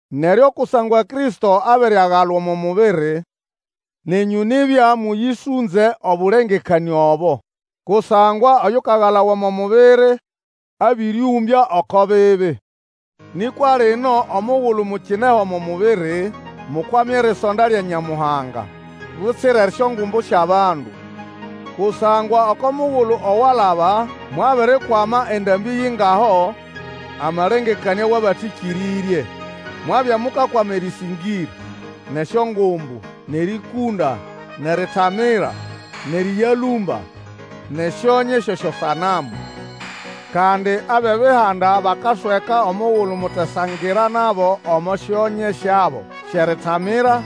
Neryo kusangwa Kristo abiriagalwa omo mubiri, nenyũ nibya mũyĩsũnze obũlengekanĩa obo, kusangwa oyukagalawa omo mubiri abĩrĩũmbya oko bibi. Nĩkwa lino omugulu mukineho omo mubiri, mukwame erisonda lya Nyamuhanga butsira esyongumbu syʼabandu. Kusangwa oko mugulu owalaba mwabirikwama endambĩ yingaho amalengekanĩa wʼabatĩkĩrĩrye. Mwabya mukakwama erĩsĩngĩra, nʼesyongumbu, nʼerĩkũnda, nʼeritamira, nʼerĩyalũmba, nʼesyonye syʼesyosanamu. Kandi abʼebihanda bakasweka omugulu mutesangira nabo omo syonye syabo syʼeritamira,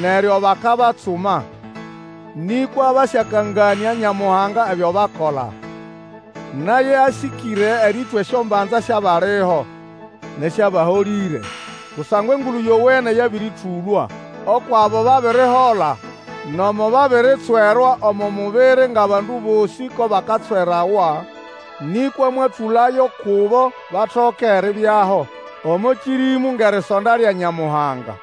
neryo bakabatsuma. Nĩkwa basyakanganĩa Nyamuhanga ebyo bakola, naye asĩkĩre erĩtwa esyombanza syʼabaliho nʼesyʼabaholĩre. Kusangwa Engulu Yowene yabĩrĩtũlwa ukwʼabo babirihola, nomo babiritswerwa omo mubiri ngʼabandu bosĩ ko bakatswerawa. Nĩkwa mwatũlayo kubo batoke eribyaho omo kĩrĩmũ ngʼerisonda lya Nyamuhanga.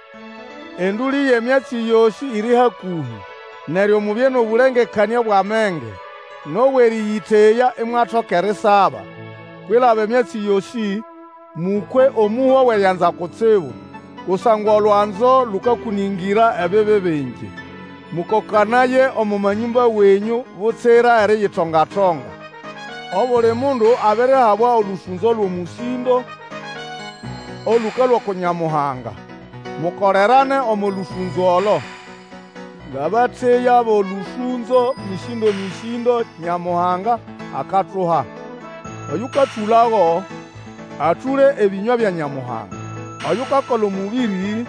Endũlĩ yʼemyatsi yosĩ iri hakũhĩ. Neryo mubye nʼobũlengekanĩa bwʼamenge, nʼobwʼerĩyĩteya, imwatoka erisaba. Kwilaba emyatsi yosĩ, mũkwe omũhwa wʼerianzana kutsibu, kusangwa olwanzo lũkakũnĩngĩra ebibi bingi. Mũkokanaye omo manyũmba wenyũ butsira eriyitonga-tonga. Obuli mundu abirihabwa olũsũnzo lwʼomũsĩndo olũkalũa uku Nyamuhanga. Mukolerane omo lũsũnzo olo, ngʼabateya bʼolũsũnzo mĩsĩndomĩsĩndo Nyamuhanga akatuha. Oyũkatũlago, atũle ebĩnywa bya Nyamuhanga. Oyukakola omũbĩrĩ,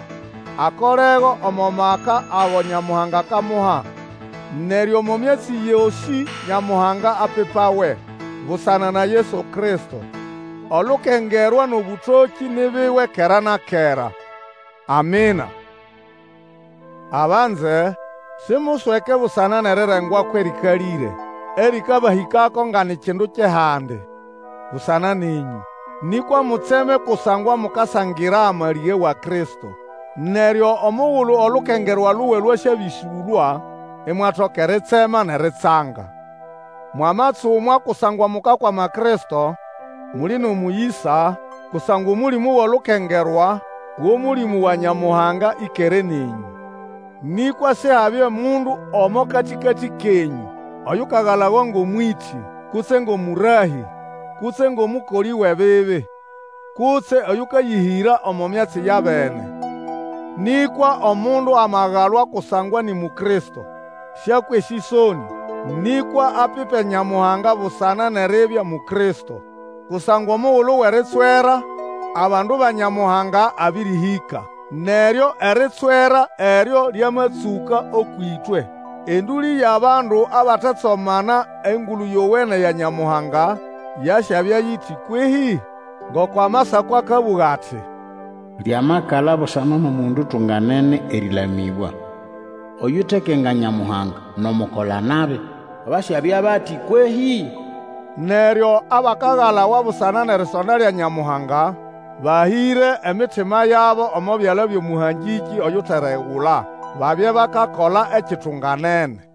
akolego omo maka ago Nyamuhanga akamuha. Neryo omo myatsi yosĩ Nyamuhanga apipawe busana na Yesu Kristo. Olukengerwa nʼobũtokĩ ni biwe kera na kera. Amina. Abanze, simusweke busana nʼerirengwako erĩkalĩre erĩkabahĩkako nga ni kindu kyʼehandi busana nenyũ. Nĩkwa mutseme kusangwa mukasangira amalĩge wa Kristo. Neryo omugulu olukengerwa luwe lwasyabĩsũlwa, imwatoka eritsema nʼeritsanga. Mwamatsumwa kusangwa mukakwama Kristo, muli nʼomũyĩsa, kusangwa Omũlĩmũ wʼolukengerwa, wʼOmũlĩmũ wa Nyamuhanga ĩkere nenyũ. Nĩkwa Sihabye mundu omo katĩkatĩ kenyũ oyukagalawa ngʼomwĩtĩ, kutse ngʼomũrahĩ, kutse ngʼomũkolĩ wʼebibi, kutse oyũkayĩhĩra omo myatsi ya bene. Nĩkwa omundu amagalwa kusangwa ni Mukristo, sĩakwe esĩsonĩ, nĩkwa apipe Nyamuhanga busana nʼeribya Mukristo. Kusangwa omugulu wʼeritswera abandu ba Nyamuhanga abĩrĩhĩka. Neryo eritswera eryo lyamatsũka ũkwʼĩtwe, endũlĩ yʼabandu abatetsomana Engulu Yowene ya Nyamuhanga yasyabya yiti kwehĩ? Ngoko Amasako akabũga ati, Lyamakala busana nʼomundu utunganene erĩlamĩbwa, Oyutekenga Nyamuhanga, nʼomukolanabi, basyabya bati kwehĩ? Neryo abakagalawa busana nʼerisonda lya Nyamuhanga, bahĩre emitima yabo omo byala byʼOmũhangĩkĩ oyuteregula, babye bakakola ekitunganene.